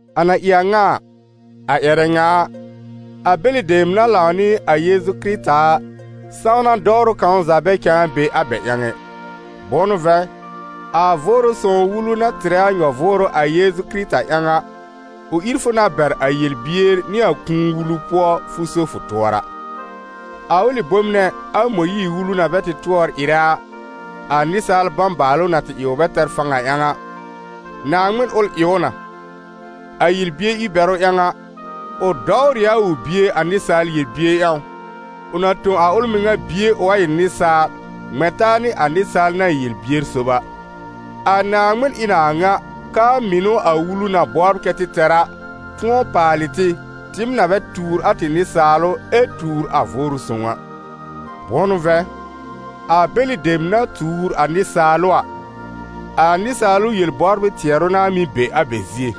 A na ɩ a ŋa a, a ƴɛrɛ ŋa a, a bɛlɩ dem na lãw nɩ a Yeezu Kɩrɩta a, sãwna dɔwrʋ kãw za bɛ cãa be a bɛ ƴãw ɛ. Bʋ̃ʋ n'ʋ vɛ̃, a Vʋʋrʋ Sõw Wulu na tɩrɛ a nyɔ-vʋʋrʋ a Yeezu Kɩrɩta ƴãw a, ʋ ír fʋ na bɛr a yel-bier nɩ a kũu wulu pʋɔ, fʋ so fʋ tʋɔra. A ʋlɩ bom nɛ, a Mõyiir-Wulu na tɩ bɛ tʋɔr ɩrɛ a, a nɩsaal bãbaalʋ na tɩ ɩ ʋ bɛ tɛr fãw a ƴãw a, Naaŋmɩn ʋl ɩ ʋ na: a yel-bier ír-bɛrʋ ƴãw a, ʋ dɔwr ɩ a ʋ Bie a nɩsaal yel-bier ƴãw, ʋ na tõ a ʋl mɩŋa Bie ʋ wa ɩ nɩsaal, ŋmɛ̃ taa nɩ a nɩsaal na ɩ yel-bier sob a. A Naaŋmɩn ɩ n a a ŋa, k'aa mɩnʋ a Wulu na bɔbr kɛ tɩ tɛr a, tʋ̃ɔ paalɩ tɩ, tɩɩm na bɛ tuur a tɩ nɩsaalʋ ɛ tuur a Vʋʋrʋ Sõw a. Bʋ̃ʋ n'ʋ vɛ̃, a bɛlɩ dem na tuur a nɩsaalʋ a, a nɩsaalʋ yel-bɔbrɩ tɩɛrʋ n'a mɩ́ be a bɛ zie.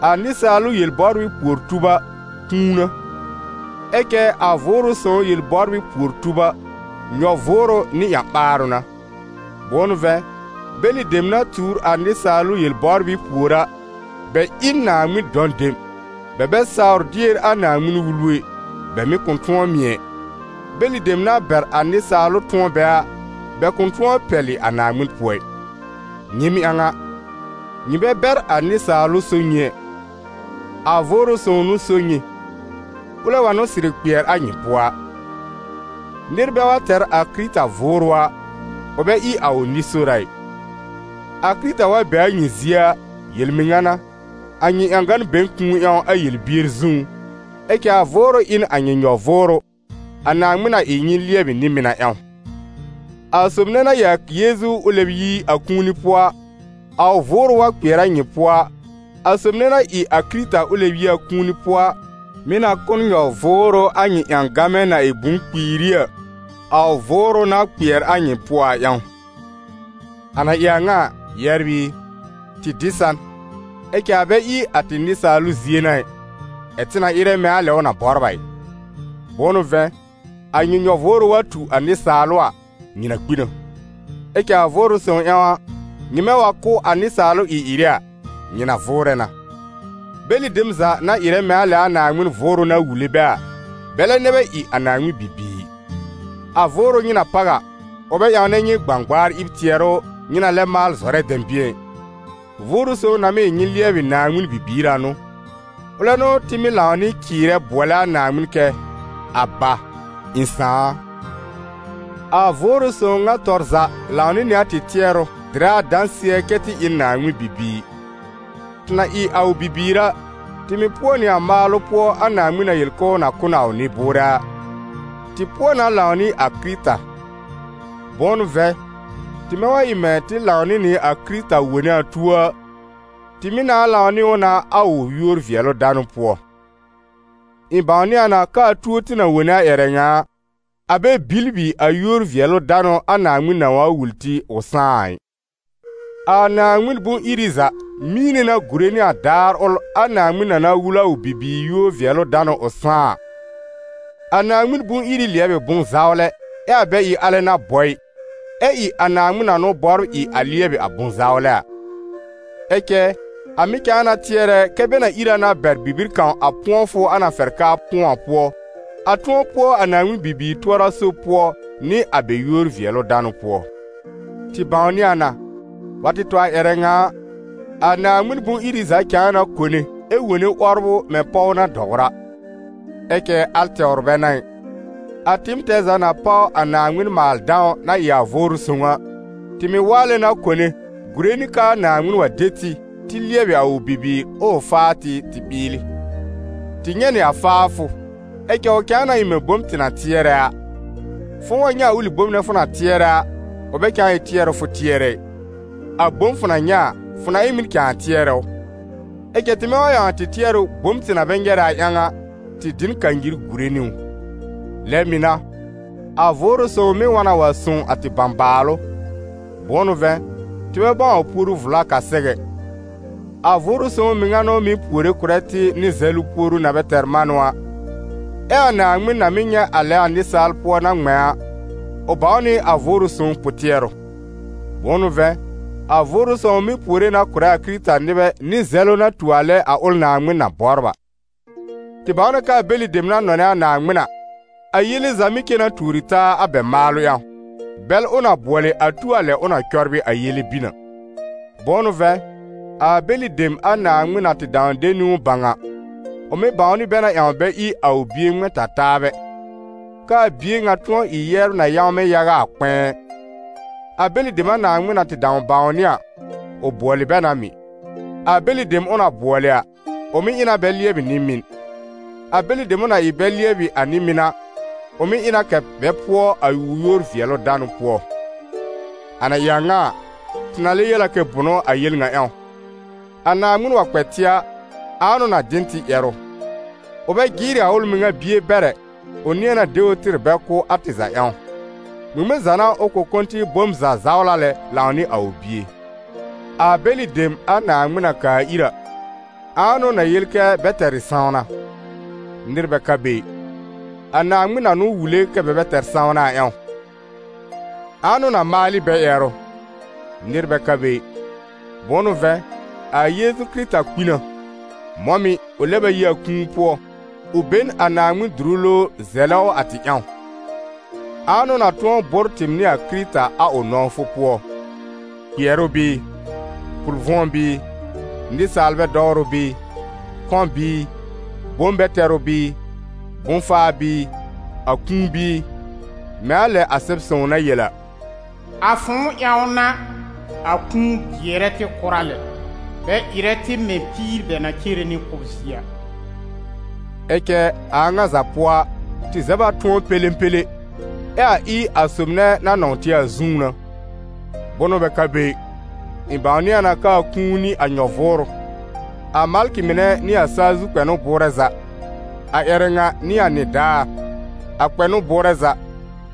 A nɩsaalʋ yel-bɔbrɩ pùor-tub a, kũu n'a; ɛ cɛ a Vʋʋrʋ Sõw yel-bɔbrɩ pùor-tub a, nyɔ-vʋʋrʋ nɩ ƴã-ɓaarʋ n'a. Bʋ̃ʋ n'ʋ vɛ̃, bɛlɩ dem na tuur a nɩsaalʋ yel-bɔbrɩ pùor a, bɛ ɩ n Naaŋmɩn dɔ̃ dem, bɛ bɛ sawr dier a Naaŋmɩn-Wulu ɛ, bɛ mɩ̀ kʋ̃ tʋ̃ɔ mɩ̀ ɛ. Bɛlɩ dem na bɛr a nɩsaalʋ tʋ̃ɔ bɛ a, bɛ kʋ̃ tʋ̃ɔ pɛlɩ a Naaŋmɩn pʋɔ ɩ. Nyɩɩm ƴãw a, nyɩ bɛ bɛr a nɩsaalʋ so nyɩ ɛ; a Vʋʋrʋ Sõw n'ʋ so nyɩ, ʋlɛ wa n'ʋ sɩrɩ kpɩɛr a nyɩ pʋɔ a. Nɩr bɛ wa tɛr a Kɩrɩta Vʋʋrʋ a, ʋ bɛ ɩ a ʋ nɩ-sora ɩ. A Kɩrɩta wa be a nyɩ zie a, yel-mɩŋa n'a, a nyɩ ƴãgan be n kũu ƴãw a yel-bier zũú, ɛ cɛ a Vʋʋrʋ ɩ n a nyɩ nyɔ-vʋʋrʋ, a Naaŋmɩn na ɩ nyɩ lɩɛbɩ nɩ-mɩn a ƴãw. A sob nɛ na ɩ a Yeezu ʋ lɛb yi a kũuni pʋɔ a, a ʋ Vʋʋrʋ wa kpɩɛr a nyɩ pʋɔ a, a sob nɛ na ɩ a Kɩrɩta ʋ lɛb yi a kũuni pʋɔ a, mɩ̀ na kʋ̀ n nyɔ-vʋʋrʋ a nyɩ ƴãgamɛ na ɩ bʋ̃-kpiiri a, a ʋ Vʋʋrʋ na kpɩɛr a nyɩ pʋɔ a ƴãw. A na ɩ a ŋa a, yɛbr ɩ, tɩ dɩ n san, ɛ cɛ a bɛ ɩ a tɩ nɩsaalʋ zie n'a ɩ, ɛ̀ tɩ na ɩrɛ mɛ̃ a lɛ ʋ na bɔbr a ɩ. Bʋ̃ʋ n'ʋ vɛ̃, a nyɩ nyɔ-vʋʋrʋ wa tu a nɩsaalʋ a, nyɩ na kpi na. Ɛ cɛ a Vʋʋrʋ Sõw ƴãw, nyɩmɛ wa kʋ́ a nɩsaalʋ ɩ-ɩrɩ a, nyɩ na vʋʋrɛ na. Bɛlɩ dem za na ɩrɛ mɛ̃ a lɛ a Naaŋmɩn Vʋʋrʋ na wule bɛ a, bɛlɛ nɛ bɛ ɩ a Naaŋmɩn bibiir. A Vʋʋrʋ nyɩ na páw a, ʋ bɛ ƴãwnɛ nyɩ gbãgbaar ɩb tɩɛrʋ nyɩ na lɛb maal zɔrɛ dɛ̃bɩ̃ɛ ɩ; Vʋʋrʋ Sõw na mɩ́ ɩ nyɩ lɩɛbɩ Naaŋmɩn bibiir a n'ʋ. Ʋlɛ n'ʋ tɩ mɩ́ lãw nɩ cɩɩrɛ bʋɔlɛ a Naaŋmɩn kɛ: «Aba, ɩ̃ Sãà a!» A Vʋʋrʋ Sõw ŋa tɔr za lãw nɩ nɩ a tɩ tɩɛrʋ dɩrɛ a dãsɩɛ kɛ́ tɩ ɩ n Naaŋmɩn bibiir. Tɩ na ɩ a ʋ bibiir a, tɩ mɩ̀ pʋɔ nɩ a maalʋ pʋɔ a Naaŋmɩn na yel k'ʋʋ na kʋ̀ n a ʋ nɩ-bʋʋrɛ a, tɩ pʋɔ na lãw nɩ a Kɩrɩta; bʋ̃ʋ n'ʋ vɛ̃, tɩmɛ wa ɩ mɛ̃ tɩ lãw nɩ nɩ a Kɩrɩta wone a tuo a, tɩ mɩ̀ nãà lãw nɩ ʋ na a ʋ yúor-vɩɛlʋ-danʋ pʋɔ. Ɩ̃ bãwnɩ a na k'aa tuo tɩ na wone a ƴɛrɛ ŋa a, a bɛ bibli a yúor-vɩɛlʋ-danʋ a Naaŋmɩn nãà wa wul tɩ ʋ sãá a ɩ. A Naaŋmɩn bʋ̃-iri za mĩine na gùre nɩ a daar ʋl a Naaŋmɩn na na wul a ʋ bibiir yúor-vɩɛlʋ-danʋ ʋ sãá a. A Naaŋmɩn bʋ̃-iri lɩɛb ɩ bʋ̃-zawlɛ, ɛ a bɛ ɩ alɛ n'a bɔ ɩ, ɛ ɩ a Naaŋmɩn na n'ʋ bɔbr ɩ a lɩɛbɩ a bʋ̃-zawlɛ a. Ɛ cɛ a mɩ̀ cãa na tɩɛrɛ kɛ bɛ na ír a na bɛr bibir kãw a pʋ̃ɔfʋ a na fɛr k'aa pʋ̃ɔ a pʋɔ, a tʋ̃ɔ pʋɔ a Naaŋmɩn bibiir tʋɔra-sob pʋɔ nɩ a bɛ yúor-vɩɛlʋ-danʋ pʋɔ. Tɩ bãwnɩ a na, wa tɩ tɔ a ƴɛrɛ ŋa a, a Naaŋmɩn bʋ̃-iri za cãa na kone ɛ wone 'wɔbrʋ mɛ̃ pɔw na dɔwr a. Ɛ cɛ al tɛwr bɛ n'a ɩ: a tɩɩm tɛɛ za na páw a Naaŋmɩn maal-dãw na ɩ a Vʋʋrʋ Sõw a, tɩ mɩ̀ waalɛ na kone gùre nɩ k'aa Naaŋmɩn wa de tɩ, tɩ lɩɛbɩ a ʋ bibiir, ʋʋ faa tɩ tɩ ɓɩɩlɩ. Tɩ nyɛ̃ nɩ a faafʋ, ɛ cɛ ʋ cãa na ɩ bom tɩ na tɩɛrɛ a. Fʋ̃ʋ wa nyɛ̃ a ʋlɩ bom fʋ na tɩɛrɛ a, ʋ bɛ cãa ɩ tɩɛrʋ fʋ tɩɛrɛ ɩ: a bom fʋ na nyɛ̃ a, fʋ na ɩ n ŋmɩn cãa tɩɛrɛ ʋ? Ɛ cɛ tɩmɛ wa ƴãw a tɩ tɩɛrʋ bom tɩ na bɛ nyɛrɛ a ƴãw a, tɩ dɩ n kanyir gùre nɩ ʋ. Lɛ mɩ̀ n'a, a Vʋʋrʋ Sõw mɩ́ wa na wa sõw a tɩ bãbaalʋ. Bʋ̃ʋ n'ʋ vɛ̃, tɩ bɛ bãw a puoru vla k'a sɛw ɛ; a Vʋʋrʋ Sõw mɩŋa n'ʋ mɩ́ puore kʋ̀rɛ tɩ nɩ zɛlʋ puoru na bɛ tɛr manʋ a. Ɛ a Naaŋmɩn na mɩ́ nyɛ̃ a lɛ a nɩsaal pʋɔ na ŋmɛ̃ a, ʋ bãw nɩ a Vʋʋrʋ Sõw pʋ-tɩɛrʋ: bʋ̃ʋ n'ʋ vɛ̃, a Vʋʋrʋ Sõw mɩ́ puore na kʋ̀rɛ a Kɩrɩta-nɩbɛ nɩ zɛlʋ na tu a lɛ a ʋl Naaŋmɩn na bɔbr a. Tɩ bãw na k'aa bɛlɩ dem na nɔnɛ a Naaŋmɩn a, a yele za mɩ́ cen na tuori taa a bɛ maalʋ ƴãw, bɛl ʋ na bʋɔlɩ a tu a lɛ ʋ na cɔbrɩ a yele bin a. Bʋ̃ʋ n'ʋ vɛ̃, a bɛlɩ dem a Naaŋmɩn na tɩ dãw de niwn bãw a, ʋ mɩ̀ bãwnɩ bɛ na ƴãw bɛ ɩ a ʋ Bie ŋmɛ̃-ta-taabɛ, k'aa Bie ŋa tʋ̃ɔ ɩ yɛbr na yãwmɛ yaga a kpɛ̃ɛ. A bɛlɩ dem a Naaŋmɩn na tɩ dãw bãwnɩ a, ʋ bʋɔlɩ bɛ na mɩ̀; a bɛlɩ dem ʋ na bʋɔlɩ a, ʋ mɩ̀ ɩ na bɛ lɩɛbɩ nɩ-mɩn; a bɛlɩ dem ʋ na ɩ bɛ lɩɛbɩ nɩ-mɩn a, ʋ mɩ̀ ɩ na kɛ̀ bɛ pʋɔ a ʋ yúor-vɩɛlʋ-danʋ pʋɔ. A na ɩ a ŋa a, tɩ na lɛ yel a kɛ bʋnʋ a yel ŋa ƴãw? A Naaŋmɩn wa kpɛ tɩ a, ãa n'ʋ na dɩ n tɩ ƴɛrʋ? Ʋ bɛ jɩɩrɩ a ʋl mɩŋa Bie bɛr ɛ, ʋ nɩ̃ɛ na de ʋ tɩr bɛ kʋ́ a tɩ za ƴãw: ŋmɩŋmɩn za n'a ʋ kʋ̃ kʋ̀ tɩ bom za zawla lãw nɩ a ʋ Bie? A bɛlɩ dem a Naaŋmɩn na kaa ir a, ãa n'ʋ na yel kɛ bɛ tɛr ɩ sãwna? Nɩr bɛ ka be ɩ. A Naaŋmɩn na n'ʋ wule kɛ́ bɛ bɛ tɛr sãwna a ƴãw. Ãa n'ʋ na maal ɩ bɛ ƴɛrʋ? Nɩr bɛ ka be ɩ. Bʋ̃ʋ n'ʋ vɛ̃, a Yeezu Kɩrɩta kpi na, mɔ̃ mɩ̀ ʋ lɛb a yi a kũu pʋɔ, ʋ be n a Naaŋmɩn dʋrʋ lowr zɛlɛ ʋ a tɩ ƴãw. Ãa n'ʋ na tʋ̃ɔ bʋ́r tɩɩm nɩ a Kɩrɩta a ʋ nɔ̃wfʋ pʋɔ? Kpɩɛrʋ bɩɩ? Pʋl-vʋ̃ɔ bɩɩ? Nɩsaalbɛ dɔwrʋ bɩɩ? Kɔ̃ bɩɩ? Bom-bɛ-tɛrʋ bɩɩ? Bʋ̃-faa bɩɩ? A kũu bɩɩ? Mɛ̃ a lɛ a Sɛb-sõw na yel a: «A fʋ̃ʋ ƴãw n'a, a kũu jɩɛrɛ tɩ kʋra lɛ, bɛ ɩrɛ tɩ mɛ̃ píir bɛ na cere nɩ kʋ́b zie a.» Ɛ cɛ a a ŋa za pʋɔ a, tɩ zɛb a tʋ̃ɔ pẽlẽpẽlẽ, ɛ a ɩ a sob nɛ na nɔ̃w tɩ a zũú n'a. Bʋnʋ bɛ ka be ɩ, ɩ̃ bãwnɩ a na k'aa kũu nɩ a nyɔ-vʋʋrʋ, a malkɩ mɩnɛ nɩ a saa zu kpɛnʋ bʋʋrɛ za, a ƴɛrɛ ŋa nɩ a nɩdaar, a kpɛnʋ bʋʋrɛ za,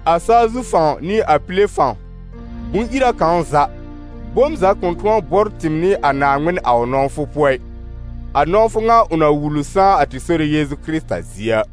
a saa zu fãw nɩ a pile fãw, bʋ̃-ira kãw za, bom za kʋ̃ tʋ̃ɔ bʋ́r tɩɩm nɩ a Naaŋmɩn a ʋ nɔ̃wfʋ pʋɔ ɩ, a nɔ̃wfʋ ŋa ʋ na wul ʋ sãá a tɩ Sore Yeezu Kɩrɩta zie a.